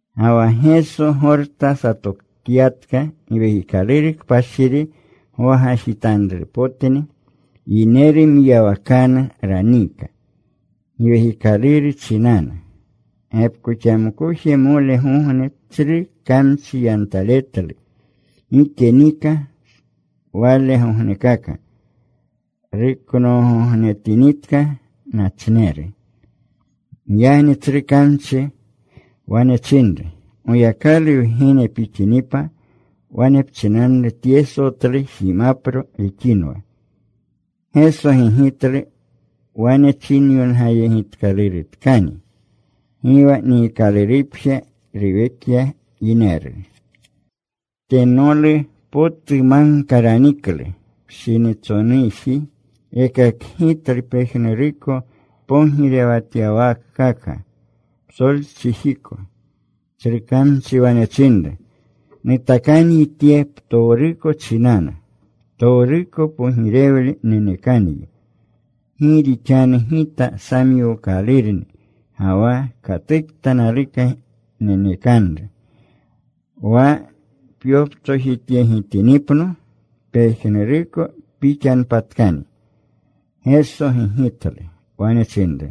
Ga wa Geso Gorta satokyatka. Giwekikaluru Kpashiri gwagajitanrupotni. Yineru mwiyawakanu raniika Giwekikaluru chinanu. Gepkoxamkojmolgogne tsru kamchi yantaletlu. Gike nika walegognekaka. Ruknoogognetinitka, nachneru. Giyagni tsru kamchi wane chinru, “Goyakalu Wgene pixinipa, wane pchinanru tye sotlu jimapro rixinwa.” Geso gigitlu, “Wane chinyongayegitkalurutkani: Gi wa niikalurupje ruwekya yineru.” Tenolu potu magka raniklu. Pshinitsonuji rekakgitlu pejnuruko pogirewatyawaakaka psolchijiko. Tsru kamchi wane chinru, “Nutakanyi tye ptowruko chinanu. Ptowruko pogirewle nenekanyi. Gi rixanu gita samyookalurni, ga wa katukta naluka nenekanru. Wa pyoptsojityegitinipno pejnuruko pixanpatkani.” Geso gigitlu, wane chinru,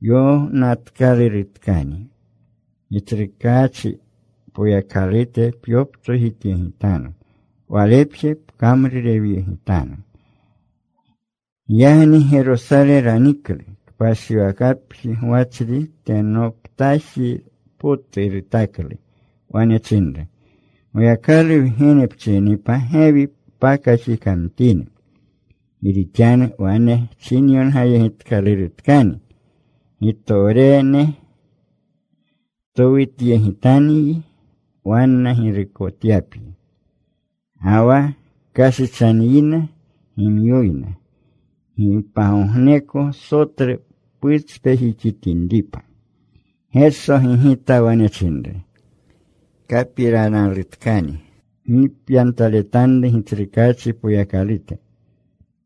“Yonatkalurutkani: Gitsrukaachi Poyakalute pyoptsojityegitanu. Walepje pkamrurewyegitanu.” Giyagni Gerosale raniklu. Kpashiwakapji gwachri tenoptaji potu rutaklu. Wane chinru, “Goyakalu Wgene pchininipa, gewi pakaxikamtini. Gi rixanu wane chinyongayegitkalurutkani: Gitowrene towutyegitanyi wanna girukotyapyi. Ga wa: Kashichanyina gimyoyna, gi pagogneko sotlu putspejixitinripa.” Geso gigita. Wane chinru, “Kapiranalutkani: Gi pyantaletanru Gitsrukaachi Poyakalute.”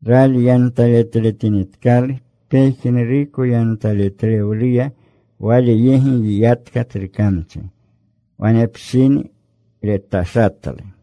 Rali yantaletletinitkalu pejnuruko yantaletlewluya, Wale yegi yiyatka tsru kamchi. Wanepshini retashatlu.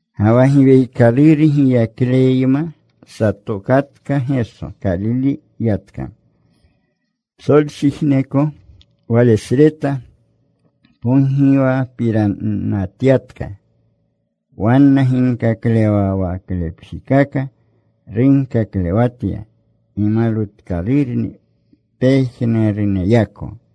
Ga wa Giwekikaluru giyakleyma satokatka Geso. Kalile yatka. Psolchijiko walesreta pogiwapiranatyatka. Wanna ginkaklewawaklepjikaka runkaklewatya. Gimalwutkalurni pejnuruneyako.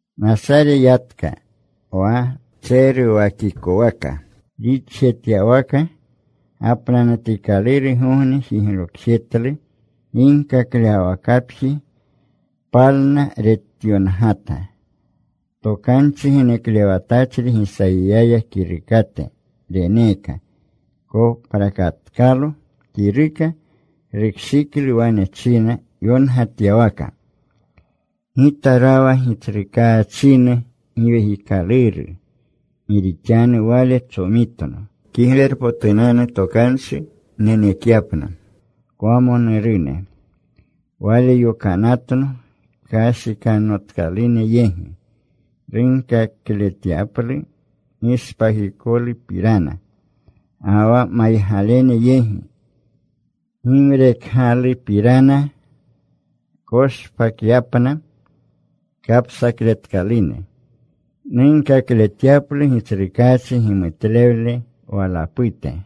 Nasare yatka, wa tseruwakikwaka. Rixjetyawaka gapnanutikalurgogne jiglokjetlu ginkaklewawakapji. Palna. Retyongata. Tokanchi geneklewatachri Gisayiya kirukate reneeka. Koprakatkalo kiruka. Rukshiklu wane china yongatyawaka: Gita rawa Gitsrukaachinu Giwekikaluru. Gi rixanu Wale tsomitno Kiglerpotunanu Tokanchi nenekyapna kwamonurune. Wale yokanatno kashikanotkalune yegi nunkakletyaplu gishpakikolupirana. Ga wa maygalene yegi, gimrekgalupirana. Nkoshpakyapna kapsakletkalune. Nunkakletyaplu Gitsrukaachi gimutlewle walapute.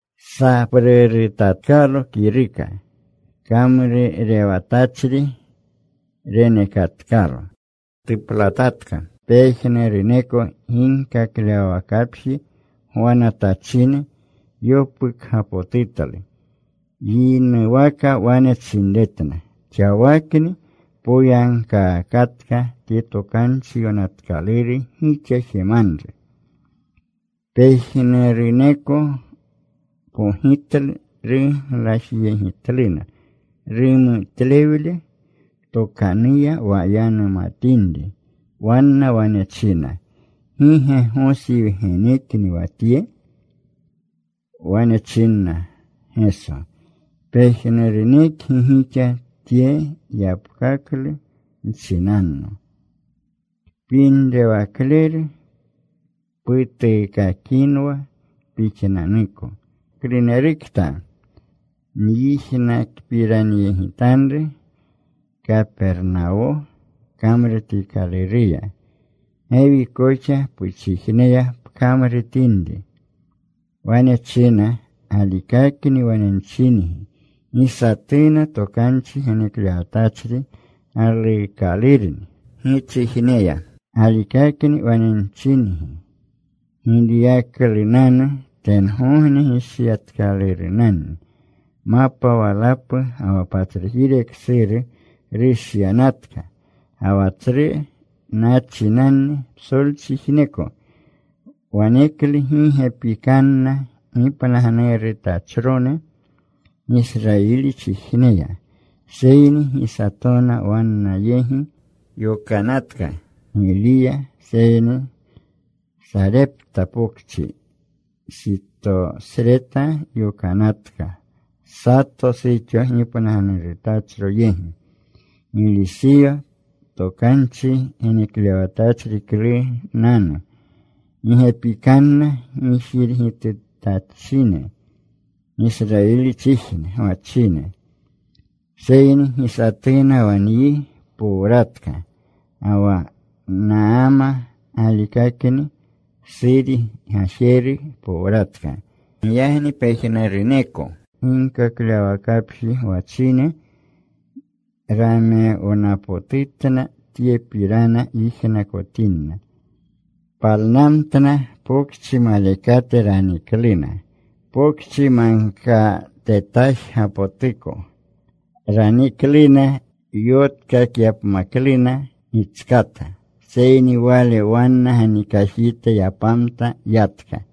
Saprurutatkalo kiruka. Kamrurewatachri renekatkalo. Tuplatatka. Pejnuruneko ginkaklewawakapji gwanatachine yopukgapotutlu. Yinuwaka wane chinretna, “Xawakni poyagkaakatka tye Tokanchi Yonatkaluru gixa jemanu.” Pejnuruneko pogitlu. Ruglajyegitluna rumutlewle tokanuya, wa yanumatinri. Wanna wane china, “¿Gi ge Gosi wgenekni wa Tye?” Wane chinna Geso, “Pejnurunekgi gixa tye yapkaklu nchinanno, ‘Kpinrewakleru, putuukakinwa pixnanuko. Klunerukta wyijnakpiranyegitanru Kapernawo kamrutikaluruya, gewi koxa puchijneya pkamrutinri.’” Wane china, “Galikakni wane nchingi, gi satuna tokanchi geneklewatachri galuukalurni gichijneya. Galikakni wane nchingi, Giliyaklunanu tengogne gishyatkalurunanni. Mapa walapu ga wa patsrujire ksuru rushyanatka, ga wa tsru nachinanni psolchijneko. Waleklu gi gepikananna gipnagnurutachrone Gisrayilichijneya. Seyni gi satona wanna yegi yokanatka Giliya, seyni Sarepta Pokchi, Sitosreta yokanatka, sato suxo gipnagnurutachro yegi. Giliseyo tokanchi geneklewatachriklunanu gi gepikananna gijirgitutachine Gisrayilchijne gwachine. Seyni gi satuna wa nyi powratka. Ga wa Naama galikakni Suri gajeru powratka.” Giyagni pejnuruneko ginkaklewawakapji gwachine ramewnapotutna, tyepirana yijnakotinna. Palnamtna. Pokchi malekate ranikluna. Pokchi magkatetajgapotuko ranikluna, yotkakyapmakluna gitskata. Seyni Wale wanna ganikajite yapamta. Yatka.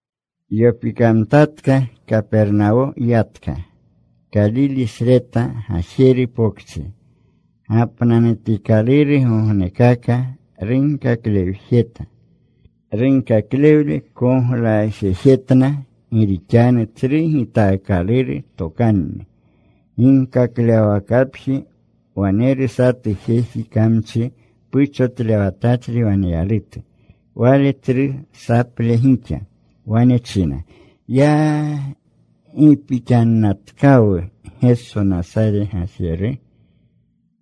Yopikamtatka. Kapernawo yatka, Kalilesreta gajeru pokchi. Gapnanutikalurgognekaka runkakaklewjeta. Runkaklewle koglajejetna, gi rixanu tsru gitaakaluru tokanni. Ginkaklewawakapji waneru satu jeji kamchi puchotlewatachri waneyalutu. Wale tsru saple gixa. Wane china, “¡Ya! ¿Gi pixannatkawu Geso Nasare gajeru?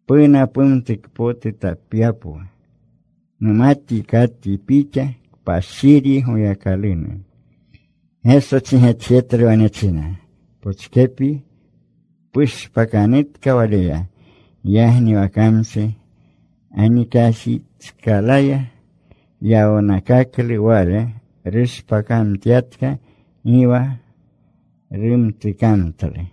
¿Puna pumtukpotutapyapwu? Numatyi katyi Pixa Kpashiryi Goyakalunu.” Geso chigetjetlu. Wane china, “Pochkepyi. Pushpakanutka waleya.” Giyagni wa kamchi ganikajitskalaya yawnakaklu. Wale rushpakamtyatka. Gi wa rumtukamtlu.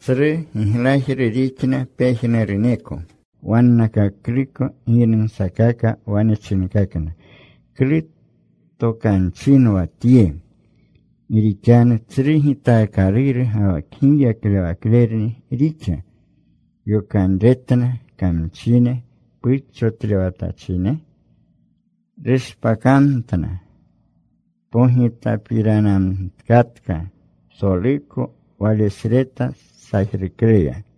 Tsru giglajru rixna pejnuruneko. Wannakakluko giynumsakaka. Wane chinkakna, “¿Klu tokanchinwa tye, gi rixanu tsru gitaakaluru ga wa kgiyaklewaklerni rixa yokanretna kamchine puchotlewatachine? Rushpakamtna.” Pogita piranamtkatka psoluko walesreta sajrukleya.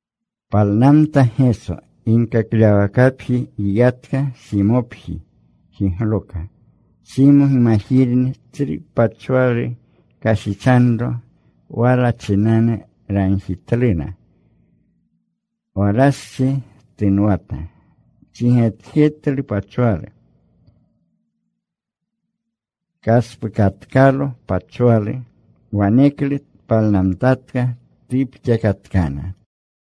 Palnamta Geso. Ginkaklewawakapji yiyatka. Simopji jigloka. Simo gimajirni tsru pachwalu kashichanro. Wala chinanu ragjitluna. Walastsi tunwata. Chigetjetlu pachwalu. Kaspukatkalo pachwalu. Waneklu tpalnamtatka. Tupxakatkana.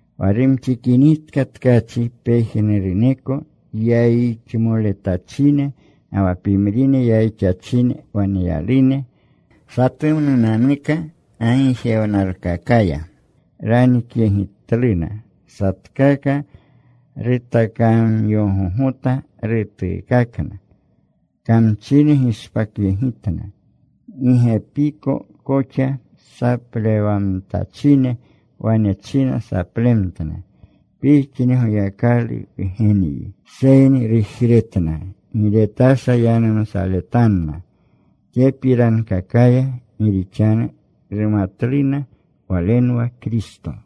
Wa rumxikinitka tkachi, pejnuruneko yayixmoletachine ga wa pimrine yayixachine waneyalune, satumnunanuka gagijewnalkakaya ranikyegitluna. Satkaka rutakamyogogota. Rutuukakna. Kamchi gishpakyegitna gi gepiko koxa. Saplewamtachine wane china saplemtna, “Pixni Goyakalu Wgenyi.” Seyni rujretna. Gi retasha yanumsaletanna tyepirankakaya, gi rixanu rumatluna Walenwa Kristo.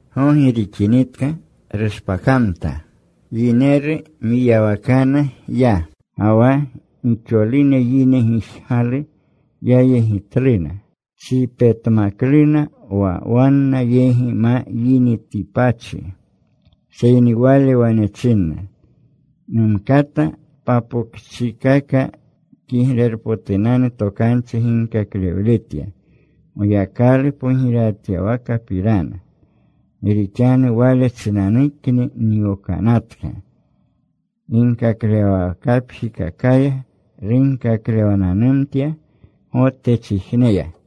Gogi rixinitka rushpakamta. Yineru mwiyawakanu ya. Ga wa gixolune yine gijgalu. Yayegitluna. Chipetmakluna wa wanna yegi ma yinitipachi. Seyni Wale wane chinna, “Numkata papokchikaka Kiglerpotunanu Tokanchi ginkaklewletya, Goyakalu pogirewatyawakapirana. Gi rixanu wale chinanukni nyokanatka.” Ginkaklewawakapjikakaya runkaklewananumtya Gotechijneya.